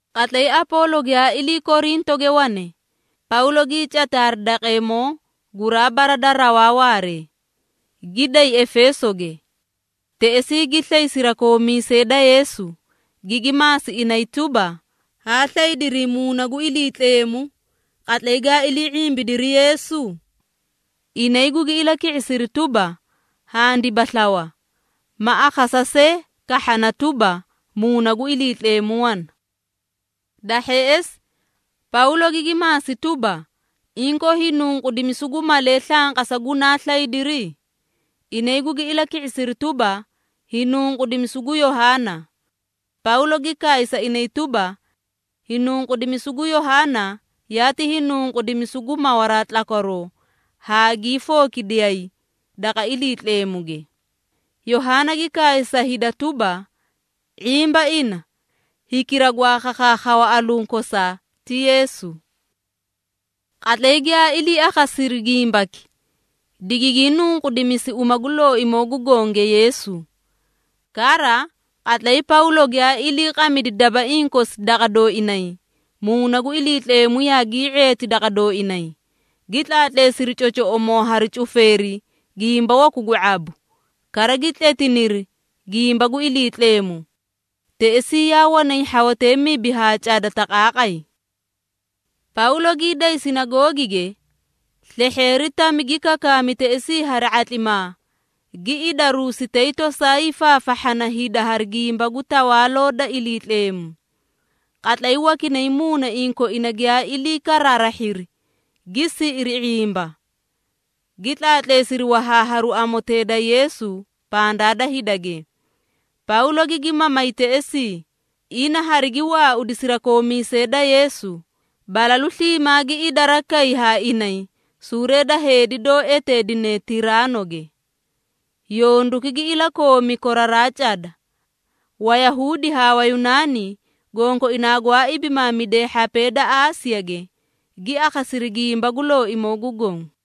Qatlay Apoolo giyaa ilii Korintoge wane, Pawlo gii cati hari daqeemoo guraa bara da rawaa waaree, gi day Efeesoge. Teꞌesii gi slay sirakoomiisee da Yeesu, gigi maasi inay tuba, “Haa slaydirii Muuna gu Iliitleemu, qatlay gaa ilii ⁄imbidiri Yeesu?” Inay gugi ilaki⁄isiri tuba, “Handiba slawa, ma akhasa see kahhana tuba, Muuna gu Iliitleemu wana.” Da hheꞌesi Pawlo gigi maasi tuba, “Inkoo hiinunqudimisu gu malee slanqasa gunaa slaydiri?” Inay gugi ilaki⁄isiri tuba, “Hiinunqudimisu gu Yohaana.” Pawlo gi kaay sa inay tuba, “Hiinunqudimisu gu Yohaana yaati hiinunqudimisu gu mawaraa tlakwaroo haa gii fookidiyay daqa Iliitleemuge. Yohaana gi kaay sa hida tuba, ⁄imba ina, hikira gwaa khakhaakhawa alunkosaa, ti Yeesu.” Qatlay giyaa ilii akhasiri gimbaki, digigii nunqudimisi uma gu Looimoo gu gonge Yeesu. Kara, qatlay Pawlo giyaa iliiqamidi dabaiĩ kosi daqa dooinay, Muuna gu Iliitleemu yaagii ⁄eeti daqa dooinay, gi tlaatleesiri cocoꞌomoo hari cufeeri gimba waku gu ⁄abu, kara gi tletiniri gimba gu Iliitleemu. Teꞌesii yaa wanay hhawatee mibi haa cada taqaaqay. Pawlo gii day sinagoogige, slehheeri tami gi kakaami teꞌesii hari ⁄atlimaa, gi idaruusi tay tosaa hiifaafahhana hida hari gimba gu Tawaaloo da Iliitleemu. Qatlay wakinay muunaiĩ koina giyaa ilii karaarahhiri, gi siꞌiri ⁄imba, gi tlaatleesiri wahaaharu Amotee da Yeesu pandaa da hidage. Pawlo gigi mamay teꞌesii, ina harigi waaudi sirakoomiisee da Yeesu, balalu sliimaa gi idara kay haa inay suuree da heedi doo eteedine Tiraanoge. Yonduki gi ilakoomi koraraa cada. Wayahuudi haa Wayunaani gonkoinaa gwaa ibimaamidee hhapee da Aasiyage, gi akhasiri gimba gu Looimoo gu Goõ.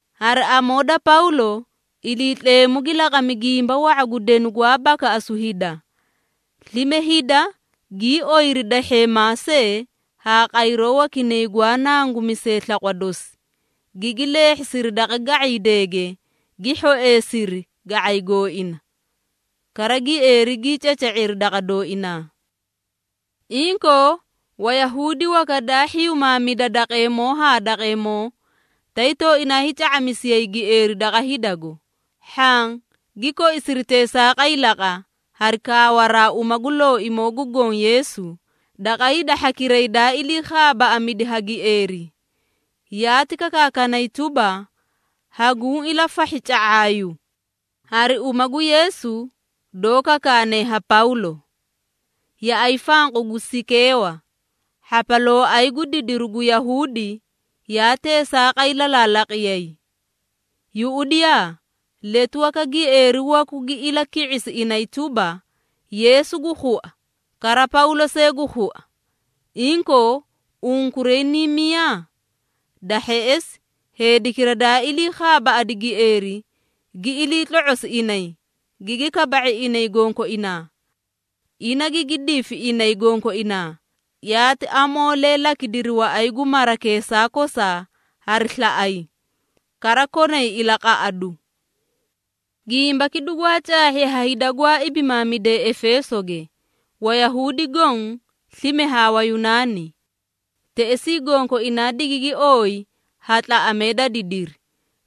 Hari amoo da Pawlo, Iliitleemu gi laqami gimba wa⁄a gu denu gwaa bakaꞌasu hida. Slime hida gii oyiri dahheemaa see haa qayroo wakinay gwaa nangumisee slaqwa dosi, gigi leehhisiri daqa ga⁄iideege, gi hhoeesiri ga⁄ay gooina, kara gieeri gii caca⁄iri daqa dooinaa. Inkoo, Wayahuudi waka daa hhiyumaamida daqeemoo haa daqeemoo, tay tooinaa hiica⁄amisiyay gieeri daqa hidago. Hhaã gi koisiri teesaaqay laqa hari kaawaraa uma gu Looimoo gu Goõ Yeesu, daqa hida hhakiray daa ilii khaabaaꞌamidi ha gieeri. Yaati kakaakanay tuba, “Haguũ ilafahhi ca⁄aayu, hari uma gu Yeesu, doó kakaane ha Pawlo.” Yaꞌay fanqu gu Sikeewa, hhapalooay gu didiru gu Yahuudi, yaa teesaaqay lalaalaqiyay. Yuꞌudiyaa! Letu waka gieeri waku gi ilaki⁄isi inay tuba, “Yeesu gu khua, kara Pawlo see gu khua. Inkoo, unkuray niĩ miyaa?” Da hheꞌesi heedikira daa ilii khaabaaꞌadi gieeri, gi ilii tlo⁄osi inay, gigi kaba⁄i inay gonkoinaa. Ina gigi difi inay gonkoinaa, yaati amoolee lakidiri waꞌay gu marakeesaa kosaa hari slaꞌay, kara konay ilaqaꞌadu. Gimbaki dugwaa caahhi ha hida gwaa ibimaamidee Efeesoge, Wayahuudi goõ slime haa Wayunaani. Teꞌesii gonkoinaa digigi ooyi ha tlaꞌamee da didiri,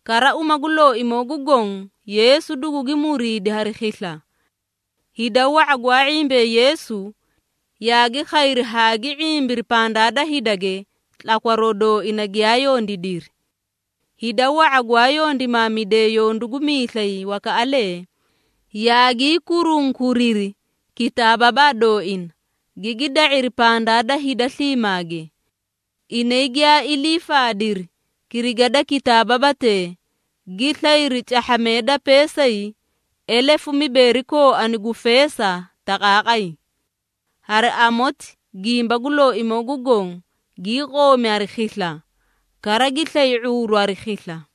kara uma gu Looimoo gu Goõ Yeesu dugugi muriidi hari khisla. Hida wa⁄a gwaa ⁄imbee Yeesu, yaagi khayri haa gi ⁄imbiri pandaa da hidage tlakwaroo dooina giyaa yondiidiri. Hida wa⁄a gwaa yondimaamidee yondu gu miislay wakaꞌalee, yaagii kurunkuriri kitaababaa dooina, gigi da⁄iri pandaa da hida sliimaage. Inay giyaa ilii faadiri kiriga da kitaababatee, gi slayri cahhamee da peesay elefu mibeeri kooani gu feesa taqaaqay. Hari amoti gimba gu Looimoo gu Goõ gii qoomi hari khisla, kara gi slay ⁄uuru hari khisla.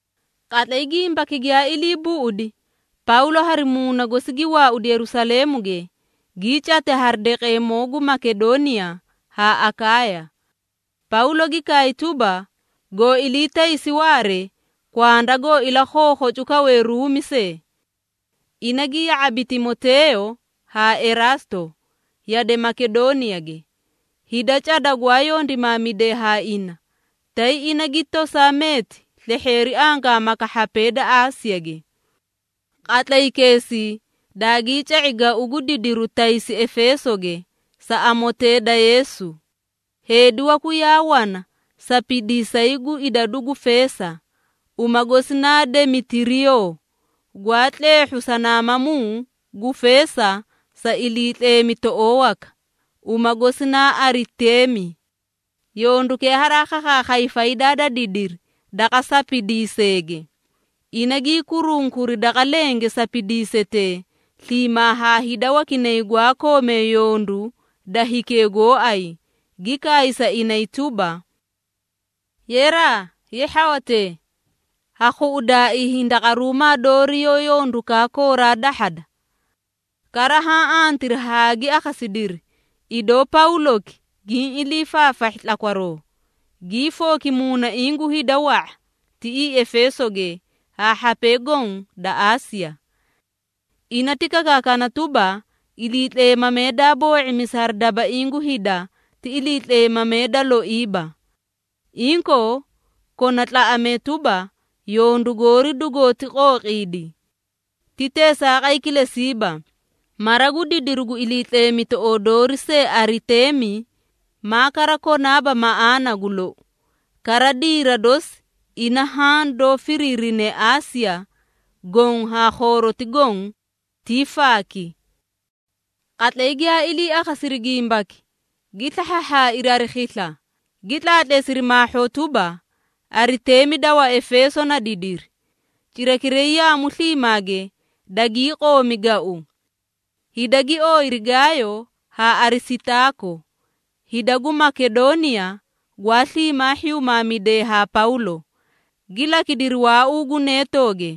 Qatlay gimbaki giyaa ilii buꞌudi, Pawlo hari muuna gosi gi waaudi Yerusaleemuge, gii cati hari daqeemoo gu Makedooniya haa Akaaya. Pawlo gi kaay tuba, “Goo ilii taysi waaree, kwanda goo ilakhookhocu kawe Ruumi see.” Ina gi ya⁄abi Timoteeyo haa Eraasto yade Makedooniyage, hida cada gwaa yondimaamidee haa ina, tay ina gi tosaa meeti slehheeri angaamaka hhapee da Aasiyage. Qatlaykeesii daagii ca⁄i gau gu didiru taysi Efeesoge sa Amotee da Yeesu. Heedi waku yaa wana sapidiisay gu idadu gu feesa, uma gosi naa Demetiriyoo, gwaa tleehhu sanamamuu gu feesa sa iliitleemitoꞌoo waka, uma gosi na Ariteemi. Yondukee haraa khakhaakhay faydaa da didiri daqa sapidiiseege. Ina gii kurunkuri daqa lenge sapidiisetee, sliimaa haa hida wakinay gwaa koomee yondu da hikee gooay, gi kaay sa inay tuba: “Yeraa! Ye hhawatee, ha khuꞌudaaii hindaqaruumaa doori yoó yondukaa kooraa dahhada!” Kara haã antiri haa gi akhasidiri, idoo Pawloki giĩ ilii faafahhi tlakwaroo, gii fooki muunaiĩ gu hida wa⁄a, tiꞌii Efeesoge haa hhapee goõ da Aasiya. Ina ti kakaakana tuba, iliitleemamee daa boo⁄imisi hari dabaiĩ gu hida ti iliitleemamee da loiiba. Inkoo, kona tlaꞌamee tuba, yondu goori dugooti qooqiidi. Ti teesaaqay kilesiiba, mara gu didiru gu iliitleemitoꞌoo doori see Ariteemi, maa kara konaaba maꞌaana gu lou, kara diira dosi ina haã doó firiirine Aasiya goõ haa khooroti goõ, tii faaki. Qatlay giyaa ilii akhasiri gimbaki, gi slahhaahhaairi hari khisla, gi tlaatleesiri maahhoo tuba, “Ariteemi da Waefeeso na didiri.” Cirakiray yaamu sliimaage dagii qoomi gau. Hida gi ooyiri Gaayo haa Arisitaako, hida gu Makedooniya gwaa sliimaa hhiyumaamidee haa Pawlo, gi lakidiri waauu gu neetooge.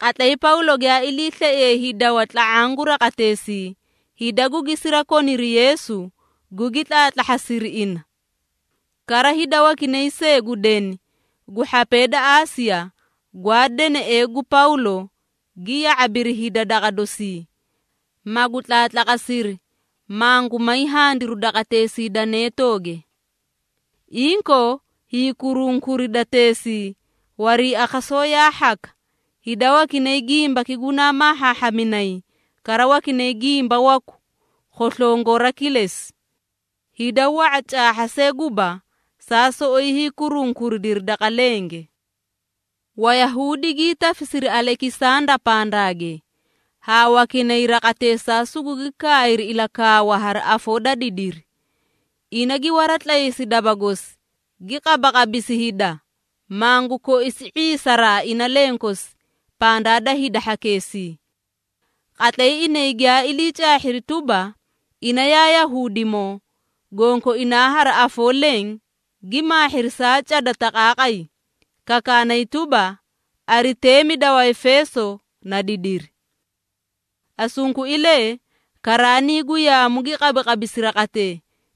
Qatlay Pawlo giyaa iliislaiye hiidawa tla⁄aã gu raqateesii, hida gugi sirakoniri Yeesu gugi tlaatlahhasiri ina. Kara hida wakinay see gu deni gu hhapee da Aasiya, gwaa deneꞌee gu Pawlo gi ya⁄abiri hida daqa doosii, magu tlaatlaqasiri, mangu may handiru daqateesii da neetooge. Inkoo, hiikurunkuridateesii wariiakhasoo yaa hhaka, hida wakinay gimbaki gunaa maahhaahhaminay, kara wakinay gimba waku, khoslongora kilesi. Hida wa⁄a caahha see guba, saa soꞌoyi hiikurunkuridiri daqa lenge. Wayahuudi gii tafisiri Alekisanda pandaage, haa wakinay raqateesaa sugugi kaayri ilakaawa hari afoo da didiri. Ina gi waratlaysi daba gosi, gi qabaqabisi hida, mangu koisi ⁄iisaraa ina lenkosi pandaa da hida hhakeesii. Qatlay inay giyaa ilii caahhiri tuba, ina yaa Yahuudimoo, gonkoinaa hari afoo leẽ gi maahhiri saa cada taqaaqay, kakaanay tuba, “Ariteemi da Waefeeso na didiri.” Asunkuilee, karaanii gu yaamu gi qabaqabisi raqatee,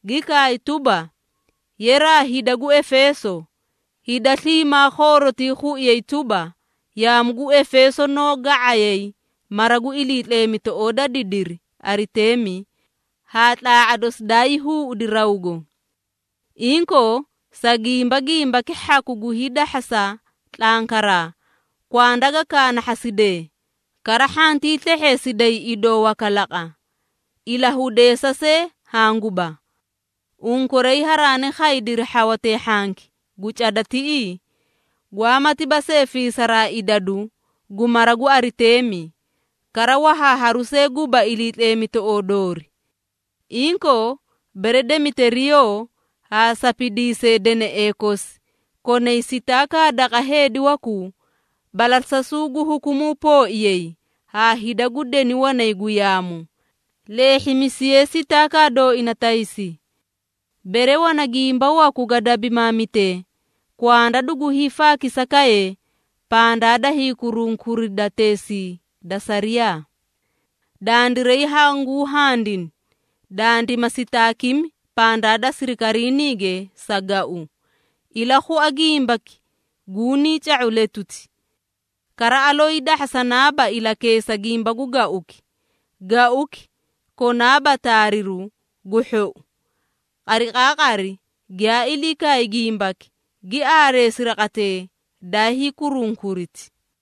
gi kaay tuba, “Yeraa hida gu Efeeso, hida sliimaa khoorotii khuiyay tuba, yaamu gu Efeeso noó ga⁄ayay mara gu iliitleemitoꞌoo da didiri Ariteemi haa tlaa⁄a dosi daayii huuꞌudi rawgo.” Inkoo, sa gimba gimbaki hhaku gu hiidahhasa tlankaraa, kwanda ga kaanahhasidee, kara hhantii slehheesiday idoo waka laqa, ilahudeesa see hanguba. Unkuray haraani khaydiri hhawatee hhanki gu cada tiꞌii, gwaamatiba see fiisaraa idadu gu mara gu Ariteemi, kara wahaaharu see guba iliitleemitoꞌoo doori. Inkoo, bere Demetiriyoo haa sapidiisee deneꞌee kosi konay sitaakaa daqa heedi wakuu, balasasuu gu hukumuu pooiyay haa hida gu deni wanay gu yaamu, leehhimisiyee sitaakaa dooina taysi. Bere wana gimba waku ga dabimaamitee, kwanda dugu hiifaakisakaye pandaa daa hiikurunkuridateesii da sariyaa. Dandiray hanguu handini, dandima sitaakimi pandaa da sirikariiniige sa gau, ilakhua gimbaki guniĩ ca⁄u letuti. Kara aloo hiidahhasanaaba ilakeesa gimba gu gauki, gauki konaaba taariru gu hhou. Qariqaaqari giyaa ilii kaay gimbaki, gi aareesi raqatee daa hiikurunkuriti.